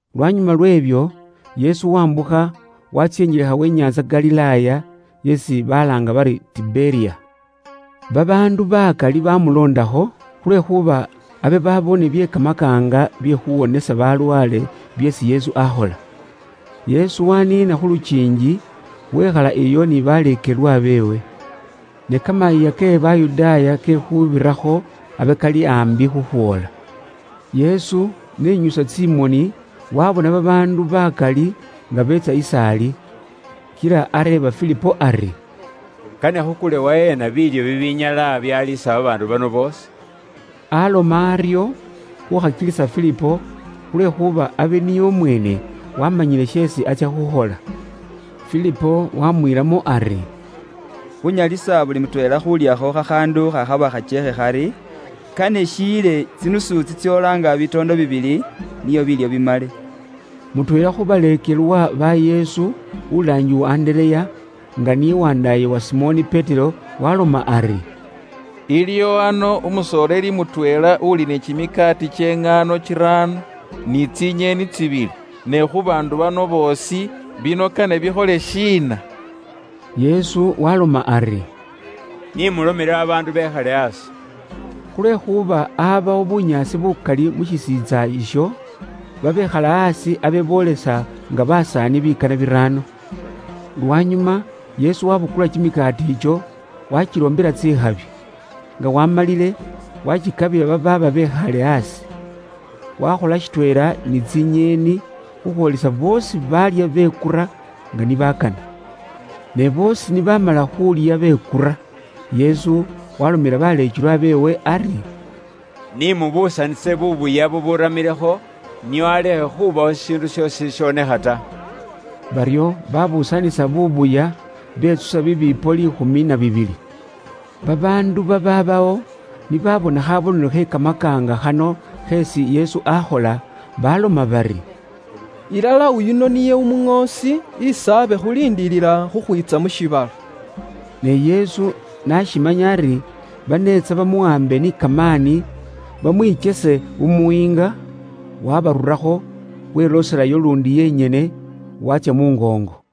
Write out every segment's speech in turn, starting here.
Lwanyuma lw'ebyo, Yesu waambukha waatsya injelekha we nyaantsa Galilaaya, isi balaanga bari Tiberiya. Babaandu bakali baamuloondakho, khulwekhuuba abe baaboone bye kamakaanga bye khuuwonisa balwaale, byeesi Yesu aakhola. Yesu waniina khu lukiingi wekhala iyo ni baleekelwa beewe. Ne Kamayiiya ke Bayudaaya ke Khuubirakho abe kali aambi khukhwoola. Yesu n'enyusa tsimoni waabona babaandu bakali nga beetsa is'ali. Kila areeba Filipo ari, “Kane khukule waheena biilyo bibinyala byaliisa babaandu bano boosi?” Aaloma aryo khuukhakilisa Filipo, khulwekhuuba abe niye umweene waamanyile sheesi atsya khukhola. Filipo wamwiilamo ari, “Khuunyalisa buli mutweela khuulyakho khakhaandu khakhaba khakyeekhe khari, kane shiyile tsidinari tsitsoola nga bitoondo bibili nio biilyo bimale.” Mutweela khu baleekelwa ba Yesu, ulaangibwa Andereya, nga niye wandaaye uwa Simoni Petero, waaloma ari, “Iliwo ano umusoleeli mutweela uli ni kimikaati kye ŋaano kiraano, ni tsinyeeni tsibili. Ne khu baandu bano boosi, bino kane bikhole shiina?” Yesu waaloma ari, “Ni mulomele babaandu bekhale aasi.” Khulwekhuuba abawo bunyaasi bukali mu shisiintsa isho. Babekhala aasi abe boolesa nga basaani bikana biraano. Lwanyuma Yesu wabukula kimikaati ikyo, wakiloombela tsikhabi. Nga waamalile, wakikabila babaaba bekhaale aasi. Wakhola shitweela ni tsinyeeni khukhwoolisa boosi baalya bekura nga ni bakana. Ne boosi ni baamala khuulya bekura, Yesu waalomela baleekelwa beewe ari, “Ni mubuusanise buubuya buburamiilekho, nio alekhe khubawo shishiindu shoosi shishonekha ta.” Baryo baabuusanisa buubuya, betsusa bibiipo liikhumi na bibili. Babaandu babaabawo ni baabona khaabonelo khe kamakaanga khano kheesi Yesu aakhola baaloma bari, “Ilala, oyuno niye umuŋoosi isi abe khuliindiilila khukhwiitsa mu shiibala.” Ne Yesu n'ashimanya ari baneetsa bamuwaambe ni kamaani bamwikyese umuyiinga, waabarurakho wilooselayo luundi yenyene, waatsya mu ngoongo.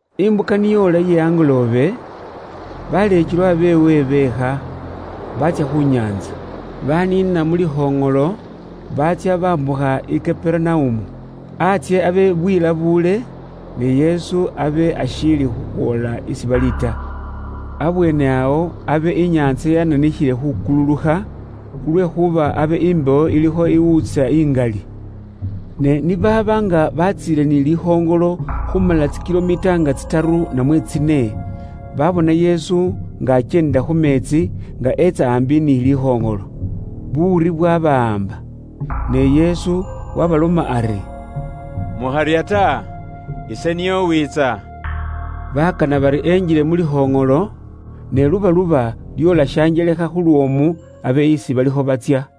Imbuka ni yoola iye angoloobe, baleekelwa beewe beekha, baatsya khu nyaantsa. Baniina mu likhoŋolo, baatsya bambukha i Kaperunaumu. Antsye abe bwilabuule, ne Yesu abe ashiili khukhwoola isi bali ta. Abweene awo abe inyaantsa yananikhile khukululukha, khulwekhuuba abe imbewo ilikho iwuutsa ingali. Ne ni baaba nga batsiile ni likhoŋolo khumala tsi kilomita nga tsitaru namwe tsine, babona Yesu nga akyeendela khu meetsi nga etsa aambi ni likhoŋolo. Buuri bwabawaamba. Ne Yesu waabaloma ari, “Mukharya ta. Ise niye uwiitsa.” Bakana bari engile mu likhoŋolo, ne lubaluba lyoola shanjelekha khu lwoomu abe isi balikho batsya.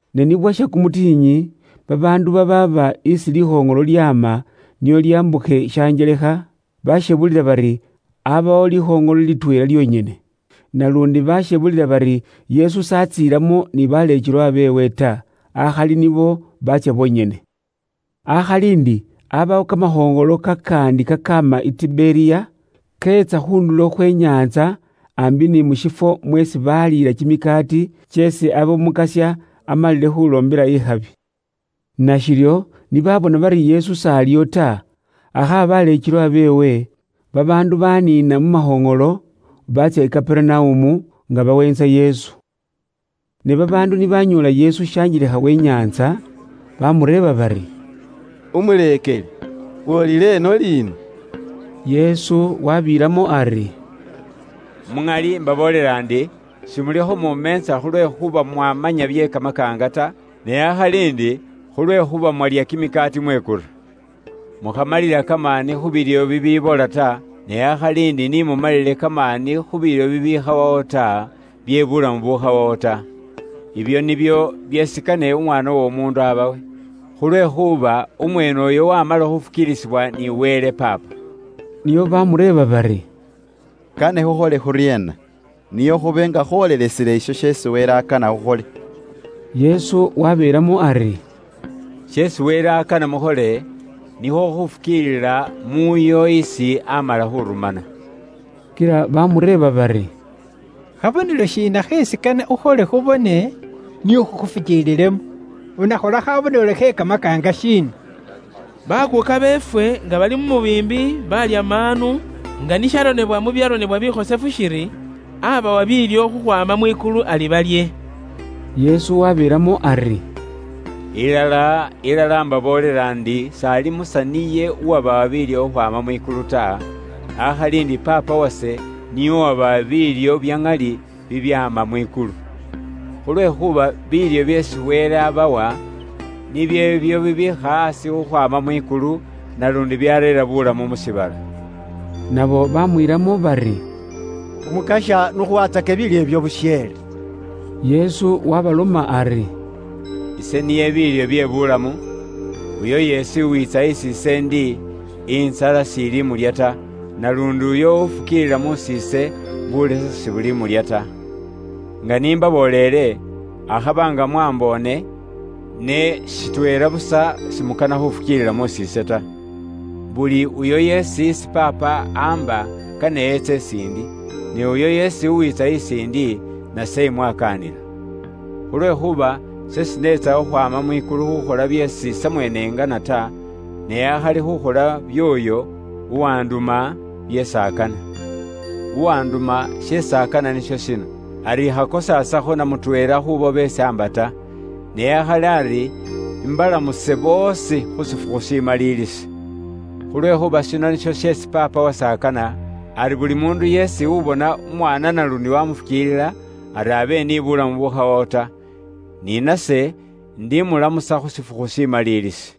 Ne ni bwasha kumutikhinyi, babaandu babaaba isi likhoŋolo lyaama nio lyambukhe shanjelekha, bashebulila bari abawo likhoŋolo litweela lyonyene. Naluundi bashebulila bari Yesu s'atsiilamo atweela ni baleekelwa beewe ta, akhali nibo baatsya bonyene. Akhali ndi abawo kamakhoŋolo kakaandi kakaama i Tiberiya, keetsa khu ndulo khwe nyaantsa, aambi ni mu shifwo mweesi baaliila kimikaati, kyeesi abe Umukasya amalile khuloombela ikhabi. Nashiryo ni baabona bari Yesu s'aliyo ta, akhaba baleekelwa beewe, babaandu baniina mu makhoŋolo baatsya i Kaperunaumu, nga baweentsa Yesu. Ne babaandu ni banyoola Yesu shanjelekha we inyaantsa, bamureeba bari, “Umuleekeli, woolile ino liina?” Yesu waabilamo ari, “Ilala, ise imbaboolela ndi, simulikho mumeentsa khulwekhuuba mwabona bye kamakaanga ta. Ne akhali ndi khulwekhuuba mwalya kimikaati mwekura. Mukhamalila kamaani khu biilyo bibibola ta, ne akhali ndi ni mumalile kamaani khu biilyo bibikhawawo bye buulamu bubukhawawo ta. Ibyo nibyo byeesi kane Umwaana w'Omuundu abawe. Khulwekhuuba umweene uyo wamala khufukiilisibwa ni Wele Paapa.” Nio baamureeba bari, “Kane khukhole khuryeena, nio khube nga khwoolelesile isho sheesi Wele akana khukhole?” Yesu wabeelamo ari, “Sheesi Wele akana mukhole, nikhwo khufukiilila muuyo isi amala khurumana.” Kila bamureeba bari, “Khabonelo shiina kheesi kane ukhole khubone, nio khukhufukiililemo? Unakhola khabonelo khe kamakaanga shiina? Bakuuka beefwe nga bali mu mubiimbi, baalya maanu, nga ni sharonebwa mu byaronebwa bikhosefu shiri, ‘Aabawa biilyo khukhwaama mwikulu ari balye.’” Yesu wabeelamo ari, “Ilala, ilala, imbaboolela ndi s'ali Musa niye uwabawa biilyo khukhwaama mwikulu ta, akhali ndi Paapa wase niye uwabawa biilyo bya ŋali bibyaama mwikulu. Khulwekhuuba biilyo byeesi Wele abawa nibyo ibyo bibiikha aasi khukhwaama mwikulu, naluundi byareera buulamu mu shiibala.” Nabo baamwiilamo bari, “Umukasya, n'ukhuwaatsake ifwe biilyo ibyo busheele.” Yesu waabaloma ari, “Ise nibyo biilyo bye buulamu. Uyo yeesi uwiitsa isi ise ndi, intsala s'ili mulya ta. Naluundi uyo ufukiilila mus'iise, bulesa sibulimulya ta. Nga ise n'imbaboleele inywe, akhaba nga mwamboone, ne shitweela busa simukana khufukiilila mus'iise ta. Buli uyo yeesi isi Paapa amba kane etse is'indi. Ne uyo yeesi uwiitsa is'indi, nase imwakaanila. Khulwekhuuba ise sineekha khukhwaama mwikulu khukhola byeesi samweene ingana ta, ne akhali khukhola by'oyo uwanduma, byeesi akana. Uwanduma sheesi akana nisho shino: ari ikhakosaasakho na mutweela kh'ubo beesi amba ta. Ne akhali ari imbalamuse boosi khu shifukhu shimaliilisi. Khulwekhuuba shino nisho sheesi Paapa wase akana, ari buli muundu yeesi ubona Umwaana naluundi wamufukiilila, ari abe ni bulamu bubukhawawo ta. Ni nase indimulamusa khu shifukhu shimaliilisi.”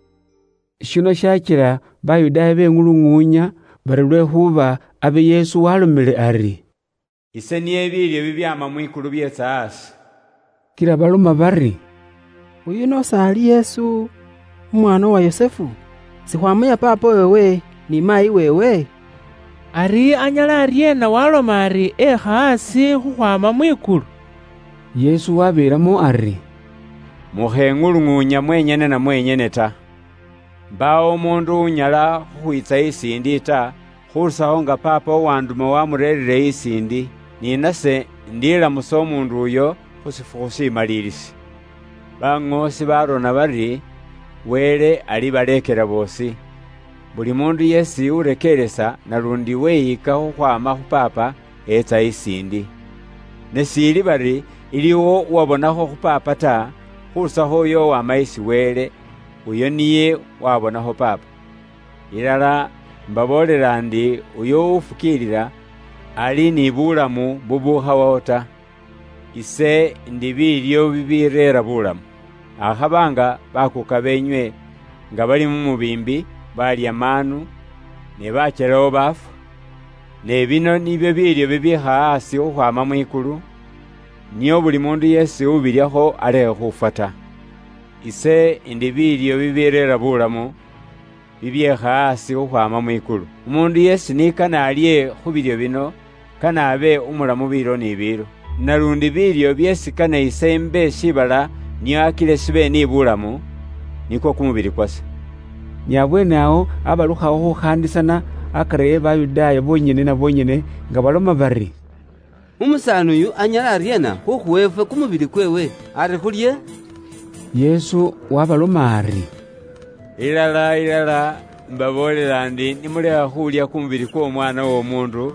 Shino shaakila Bayudaaya beŋuluŋuunya, bari lwekhuuba abe Yesu walomile ari, “Ise niye biilyo bibyaama mwikulu byeetsa aasi.” Kila baloma bari, “Uyuno s'ali Yesu, umwaana uwa Yusufu? Sikhwaamanya paapa weewe ni maayi weewe? Ari anyala aryeena waaloma ari ekha aasi khukhwaama mwikulu?” Yesu waabeelamo ari, “Mukheŋuluŋuunya mwenyene na mwenyene ta. Mbaawo umuundu unyala khukhwiitsa is'indi ta, khurusakho nga paapa uwanduma wamureerire is'indi. Ni nase indilamusa umuundu uyo khu shifukhu shimaliilisi. Baŋoosi baarona bari, ‘Wele alibaleekela boosi.’ Buli muundu yeesi urekeeresa, naluundi weyika khukhwaama khu paapa, etsa is'indi. Ne s'ili bari iliwo uwabonakho khu Paapa ta, khurusakho uyo uwama isi Wele, uyo niye waabonakho Paapa. Ilala, imbaboolela ndi uyo ufukiilila, ali ni bulamu bubukhawawo ta. Ise indi biilyo bibireera buulamu. Akhaba nga baakuuka beenywe nga bali mu mubiimbi baalya maanu, ne bakyelawo baafwa. Ne bino nibyo biilyo bibiikha aasi khukhwaama mwikulu, nio buli muundu yeesi ubilyakho alekhe khufwa ta. Ise indi biilyo bibireera buulamu, bibyeekha aasi khukhwaama mwikulu. Umuundu yeesi ni kane alye khu biilyo bino, kane abe umulamu biilo ni biilo. Naluundi biilyo byeesi kane imbe shiibala nio akile shibe ni bulamu, nikwo kumubili kwase.” Ni abweene awo abalukhawo khukhaandisana akari e Bayudaaya boonyene na boonyene nga baloma bari, “Umusaani uyu anyala aryeena khukhuwa ifwe kumubili kweewe ari khulye?” Yesu waabaloma ari, “Ilala, ilala, imbaboolela ndi ni mulekha khuulya kumubili kw'Omwaana w'Omuundu,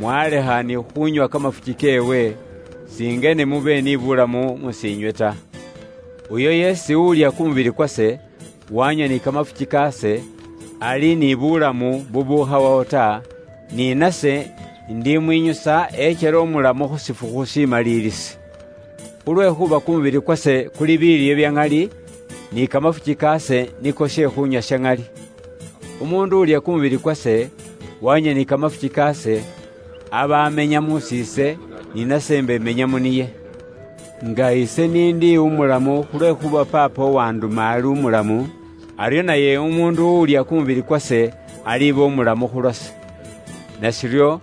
mwalekha ni khuunywa kamafuki keewe, singene mube ni bulamu mus'iinywe ta. Uyo yeesi ulya kumubili kwase, wanywa ni kamafuki kaase, aliba ni bulamu bubukhawawo ta, ni nase indimwinyusa ekyele umulamu khu shifukhu shimaliilisi. Khulwekhuuba kumubili kwase kuli biilyo bya ŋali, ni kamafuki kaase niko she khuunywa sha ŋali. Umuundu ulya kumubili kwase, wanywa ni kamafuki kaase, aba amenya mus'iise, ni nase imba imenya mu niye. Nga ise n'indi umulamu khulwekhuuba Paapa uwanduma ali umulamu, aryo naye umuundu ulya kumubili kwase aliba umulamu khu lwase. Nashiryo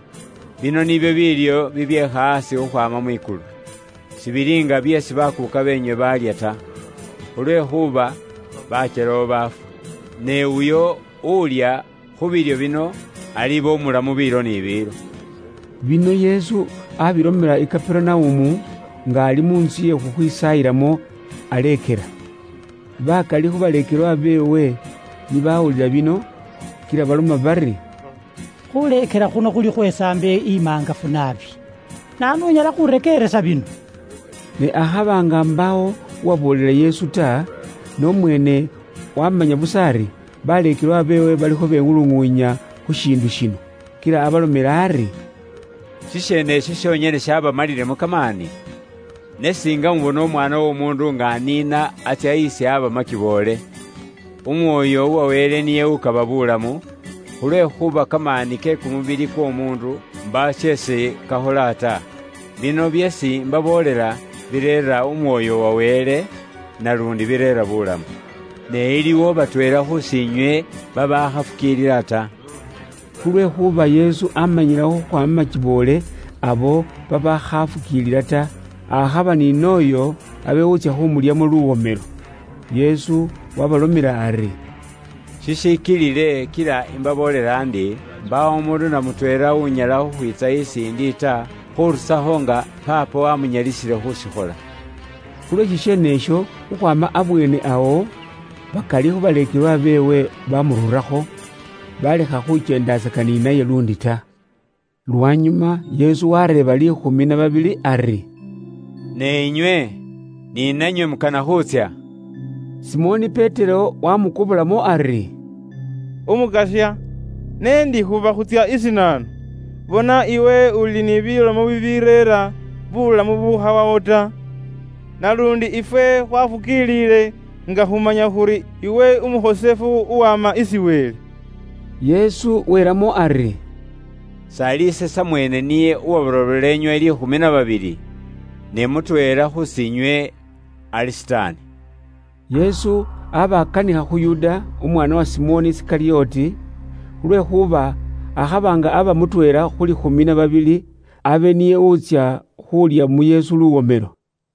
bino nibyo biilyo bibyeekha aasi khukhwaama mwikulu. Sibili nga byeesi baakuuka beenywe baalya ta. Khulwekhuuba bakyelawo baafwa. Ne uyo ulya khu biilyo bino, aliiba umulamu biilo ni biilo.” Bino Yesu abilomela i Kaperunaumu, nga ali mu ntsu iye khukhwisaayilamo aleekela. Bakali khu baleekelwa beewe ni baawulila bino, kila baloma bari, “Khuuleekela khuno khuli khwe saambo imaangafu naabi. Naanu unyala khuurekeeresa bino?” Ne akhaba nga mbaawo uwaboolela Yesu ta, ne umweene waamanya busa ari baleekelwa beewe balikho beŋuluŋuunya khu shiindu shino. Kila abalomela ari, “Shisheene isho shonyene shaabamalilemo kamaani? Ne siinga mubona Umwaana w'Omuundu nga aniina atsya isi aaba makiboole? Umwoyo uwa Wele niye ukaba buulamu; khulwekhuuba kamaani ke kumubili kw'omuundu mbaawo sheesi kakhola ta. Bino byeesi imbaboolela bireera Umwoyo uwa Wele, naluundi bireera buulamu. Ne iliwo batweela khus'inywe babaakhafukiilila ta.” Khulwekhuuba Yesu aamanyilawo khukhwaama makiboole abo babaakhafukiilila ta, akhaba ni n'oyo abe wutsya khumulyamo luwomelo. Yesu waabalomela ari, “Shishikilile kila imbaboolela ndi, mbaawo umuundu na mutweela unyala khukhwiitsa is'indi ta, khurusakho nga Paapa wamunyalisiile khushikhola.” Khulwe shisheene isho, khukhwaama abweene awo, bakali khu baleekelwa beewe bamururakho, balekha khukyendatsaka ni naye luundi ta. Lwanyuma Yesu wareeba liikhumi na babili ari, “Ne inywe? Ni nanywe mukana khuutsya?” Simoni Petero wamukobolamo ari, “Umukasya, ne ndi khuba khuutsya isi naanu? Bona iwe uli ni bilomo bibireera buulamu bubukhawawo ta. Naluundi ifwe khwafukiilile nga khumanya khuri iwe Umukhosefu uwama isi Wele.” Yesu welamo ari, “S'ali ise samweene niye uwabarobola inywe liikhumi na babili? Ne mutweela khus'inywe ali Sitaani.” Yesu aba akanikha khu Yuda, umwaana wa Simoni Isikalyoti. Khulwekhuuba akhaba nga aba mutweela khu liikhumi na babili, abe niye wutsya khulya mu Yesu luwomelo.